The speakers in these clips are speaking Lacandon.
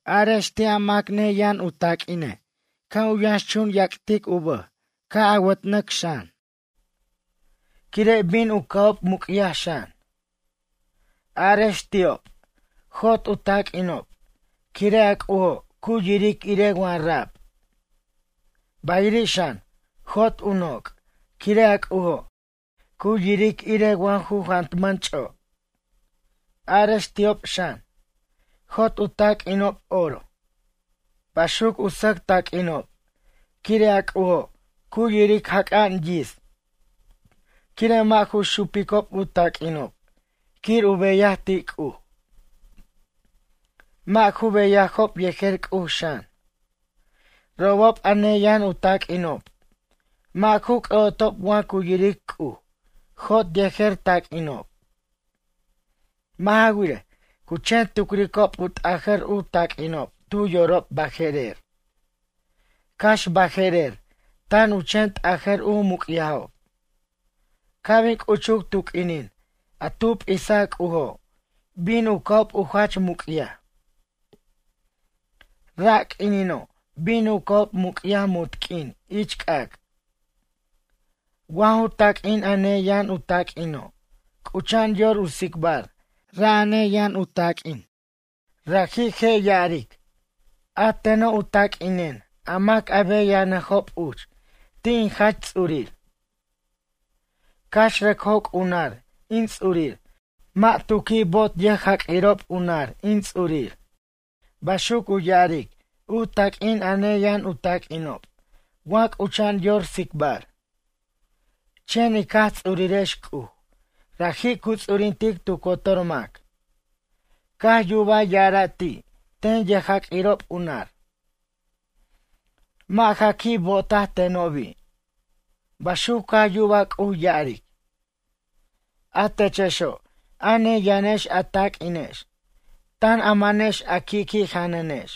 Arex ti' a mac neyʌn u taq'uine' ca' u yʌxchun yaq'uic tu bʌj ca' awat'nʌc xan. Quire' bin u ca'ob muc'yaj xan. Arex ti'ob, jot u taq'uinob quire' a C'ujo' cu yiric irej wa rab. Bayiri' xan jot u noc' quire' a C'ujo' cu yiric irej wa ju jantmʌn ch'o'. Arex ti'ob xan, jot u taq'uinob oro, baxuc u sʌc taq'uinob quire' a C'ujo' cu yiric jac'a'an yits' quire' mʌ' ju xupicob u taq'uinob quir u beyaj ti' C'uj. Mʌ' ju beyajob yejer C'uj xan. Robob a neyʌn u taq'uinob, mʌ' ju c'ʌ'otob wa cu yiric C'uj jot yejer taq'uinob. Mʌ' ja wirej, cu chen tucricob u t'ajʌr u taq'uinob tu yorob baje'rer. Cax baje'rer tan u chen t'ajʌr u muc'yajob. Ca' bin c'uchuc tu q'uinin a tu p'isa C'ujo' bin u ca'ob u jach muc'yaj. Ra' q'uinino' bin u ca'ob muc'yaj munt q'uin ich c'ac'. Wa ju taq'uin a neyʌn u taq'uino' c'ucha'an yor u tsicbar ra' a neyʌn u taq'uin, raji' je' ya'aric: “A teno' u taq'uinen a mac a beyanʌjob uch ti' in Jach Ts'urir. Cax rʌc joc' u nar in ts'urir mʌ' tu qui' bo'ot yʌjjaq'uirob u nar in ts'urir.” Baxuc u ya'aric u taq'uin a neyʌn u taquinob wa c'ucha'an yor tsicbar. Chen ic Jaj Ts'urirex C'uj raji' cu ts'urintic tu cotor mac. Caj yubaj ya'ara' ti' ten yʌjjaq'uirob u nar: “Mʌ' ja qui' bo'otaj tenobi'.” Baxuc caj yuba C'uj ya'aric. A techexo', a neyʌnex a taq'uinex, tan a manex a qui'qui' janʌnex.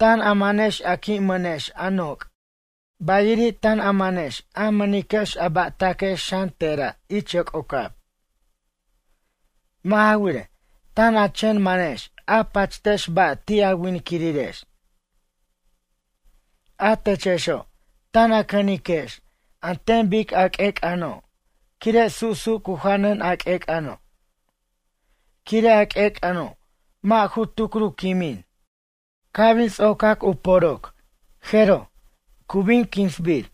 Tan a manex a qui' mʌnex a noc' bayiri' tan a manex a mʌniquex a ba'taquex xan te'ra' ich yoc'ocab. Mʌ' ja wirej, tan a chen manex a pachtex ba' ti' a winquirirex. A techexo', tan cʌniquex an ten bic a q'uec'ʌno' quire' su'su' cu janʌn a q'uec'ʌno'. Quire' a q'uec'ʌno' mʌ' ju tucr u quimin. Ca' bin ts'ocac u poroc, jeroj, cu bin quinsbir.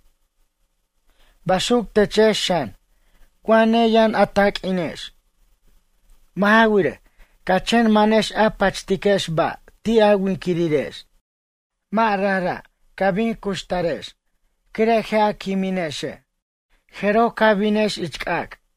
Baxuc techex xan wa neyʌn a taq'uinex. Mʌ' ja wirej, ca chen manex a pachtiquex ba' ti' a winquirirex. Mʌ' rajra', ca bin cuxtarex quire' je' a quiminexe'. Jeroj ca binex ich c'ac'.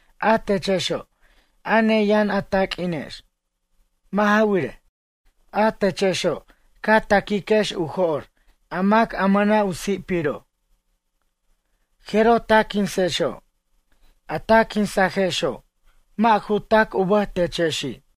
A techexo', a neyʌn a taq'uinex. Mʌ' ja wirej, a techexo' ca ta'quiquex u jo'r a mac a mʌna' u si'piro'. Jeroj ta quinsexo'. A ta quinsajexo' mʌ' ju tac u bʌj techexi'.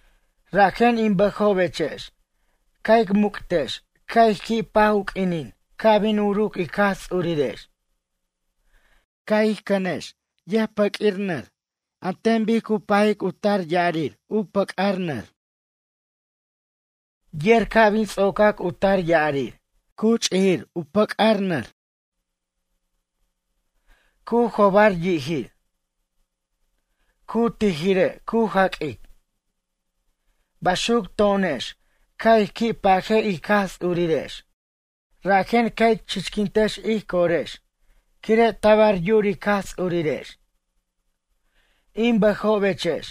Rajen in bʌjobechex, ca' ic muc'tex ca' ic qui' paj u q'uinin ca' bin uruc ic Jaj Ts'urirex. Ca' ic cʌnex yʌjpʌq'uir nar an ten bic cu pajic u tar ya'arir u pʌc'ar nar. Yer ca' bin ts'oc u tar ya'arir, cu ch'ijir u pʌc'ar nar. Cu jobar yi'jir. Cu tijire' cu jaq'uic. Baxuc to'onex ca' ij qui' paje ic Jaj Ts'urirex rajen ca' ic chichquintex ij corex quire' tabar yur ic Jaj Ts'urirex. In bʌjobechex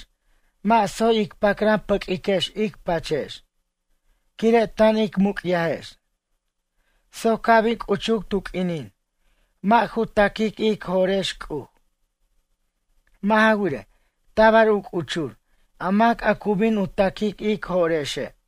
mʌ' tsoy ic pacran pʌquiquex ic pachex, quire' tan ic muc'yajex, soc ca' bin c'uchuc tu q'uinin, mʌ' ju ta'quic ic jo'rex C'uj. Mʌ' ja wirej, tabar u c'uchur a mac cu bin u ta'quic ic jo'rexe'.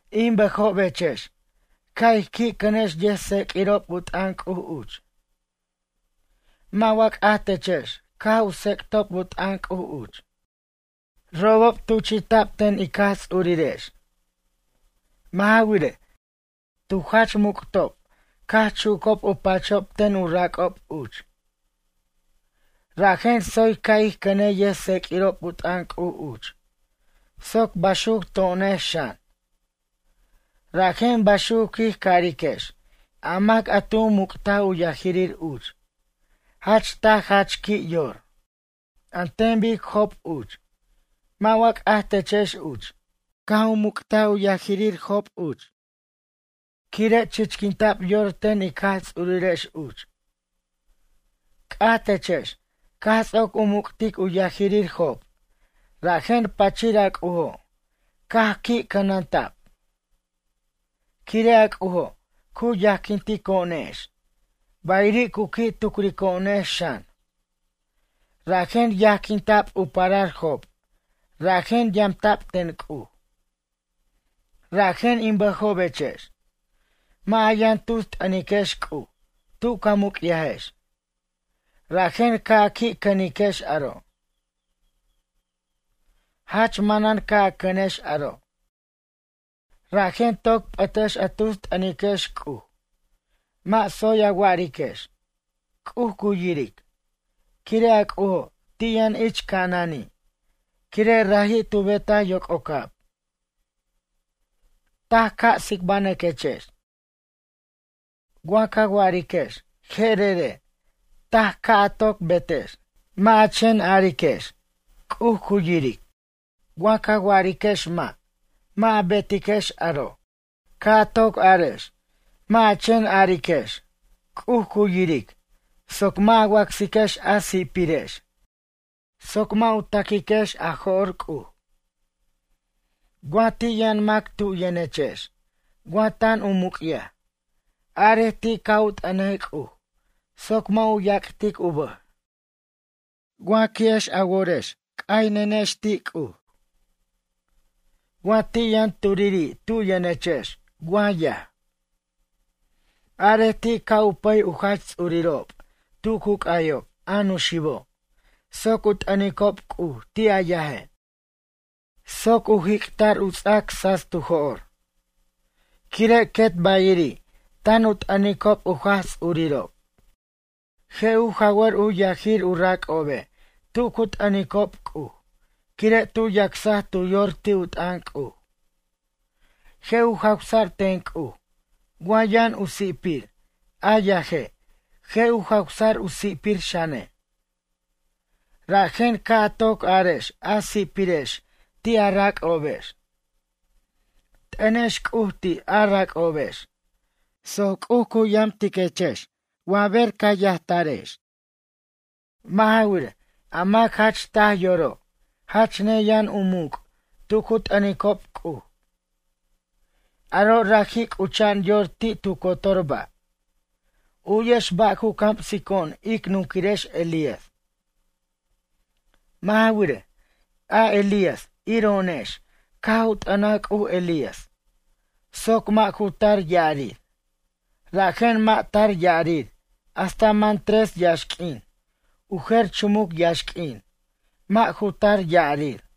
In bʌjobechex ca' ij qui' cʌnex yʌjtseq'uirob u t'ʌn C'uj uch. Mʌ' wa c'aj techex caj u tsec'tob u t'ʌn C'uj uch. Robob tuchi'ta'b ten ic Jaj Ts'urirex. Mʌ' ja wirej, tu jach muc'tob caj chucob u pachob ten u rac'ob uch. Rajen tsoy ca' ij cʌnej yʌjtseq'uirob u t'ʌn C'uj uch soc baxuc to'onex xan. Rajen baxuc quij cariquex a mac a tu muc'taj u yajirir uch, jach taj jach qui' yor. An ten bic Job uch, mʌ' wa c'aj techex uch, caj u muc't u yajirir Job uch, quire' chichquinta'b yor ten ic Jaj Ts'urirex uch. C'aj techex caj ts'oc u muc'tic u yajirir Job rajen pachir a C'ujo' caj qui' cʌnanta'b. Quire' a C'ujo' cu yajquintico'onex bayiri' cu qui' tucrico'onex xan. Rajen yajquinta'b u parar Job rajen yamta'b ten C'uj. Rajen in bʌjobechex, mʌ' a yʌn tus t'ʌniquex C'uj tu ca muc'yajex, rajen ca' a qui' cʌniquex aro'. Jach manan ca' a cʌnex aro'. Rajen toc p'ʌtex a tus t'ʌniquex C'uj. Mʌ' tsoy a wa'ariquex: “C'uj cu yiric”, quire' a C'ujo' ti' yʌn ich ca'anani' quire' raji' tu betaj yoc'ocab. Taj ca' tsicbanʌquechex. Wa ca wa'ariquex je'erere' taj ca' a toc betex. Mʌ' a chen ariquex C'uj cu yiric. Wa ca wa'ariquex mʌ' mʌ' a betiquex aro', ca' a toc arex mʌ' a chen ariquex C'uj cu yiric soc mʌ' a wacsiquex a si'pirex soc mʌ' u ta'quiquex a jo'r C'uj. Wa ti' yʌn mac tu yʌnechex wa tan u muc'yaj, arej ti' ca' u t'ʌnej C'uj soc mʌ' u yac'tic u bʌj. Wa qui'ex a worex c'aynʌquechex ti' C'uj. Wa ti' yʌn turiri' tu yʌnechex wa yaj. Arej ti' ca' u pʌy u jach ts'urirob tu cu c'ayob, a nuxibo', soc u t'ʌnicob C'uj ti' a yaje'. Soc u jic'ta'r u ts'ac tsats tu jo'r. Quire' quet bayiri' tan u t'ʌnicob u Jaj Ts'urirob. Je' u jawʌr u yajir u rac'obe' tu cu t'ʌnico' C'uj, quire' tu yacsaj tu yor ti' u t'ʌn C'uj. Je' u jawsa'r ten C'uj wa yʌn u si'pir a yaje' je' u jawsa'r u si'pir xane'. Rajen ca' a toc arex a si'pirex ti' a rac'obex. T'ʌnex C'uj ti' a rac'obex soc C'uj cu yamtiquechex wa ber ca yajtarex. Mʌ' ja wirej, a mac jach taj yoro' jach neyʌn u muc' tu cu t'ʌnicob C'uj. Aro' raji' c'ucha'an yor ti' tu cotor ba'. U'yex ba' cu camsico'on ic nunquirex Elías. Mʌ' ja wirej, a Elías iro'onex caj u t'ʌnaj C'uj Elías soc mʌ' ju tar ya'arir, rajen mʌ' tar ya'arir hasta man tres yaxq'uin u jer chumuc yaxq'uin mʌ' ju tar ya'arir.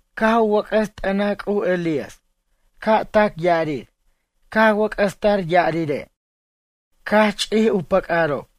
Caj u wʌc'ʌs t'ʌnaj C'uj Elías ca' tac ya'arir caj wʌc'ʌs tar ya'arire', caj ch'ij u pʌc'ʌrob.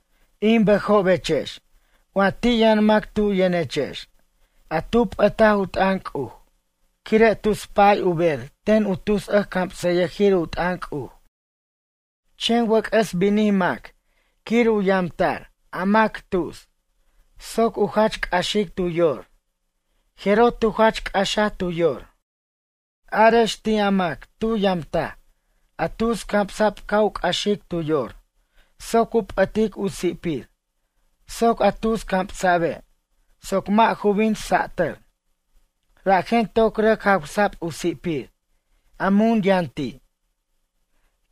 In bʌjobechex wa ti' yʌn mac tu yʌnechex a tu p'ʌtaj u t'ʌn C'uj quire' tus pa'ay u ber ten u tus ʌjcamsʌyʌjir u t'ʌn C'uj. Chen wʌc'ʌs binij mac quir u yamta'r a mac tus soc u jach c'axic tu yor, jeroj tu jach c'axaj tu yor. Arex ti' a mac tu yamtaj a tus camsa'b ca' u c'axic tu yor soc u p'ʌtic u si'pir soc a tus camsa'be' soc mʌ' ju bin sa'tʌr, rajen toc rʌc jawsa'b u si'pir a mun yʌn ti'.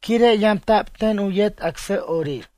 Quire' yamta'b ten u yet acsʌ'orir.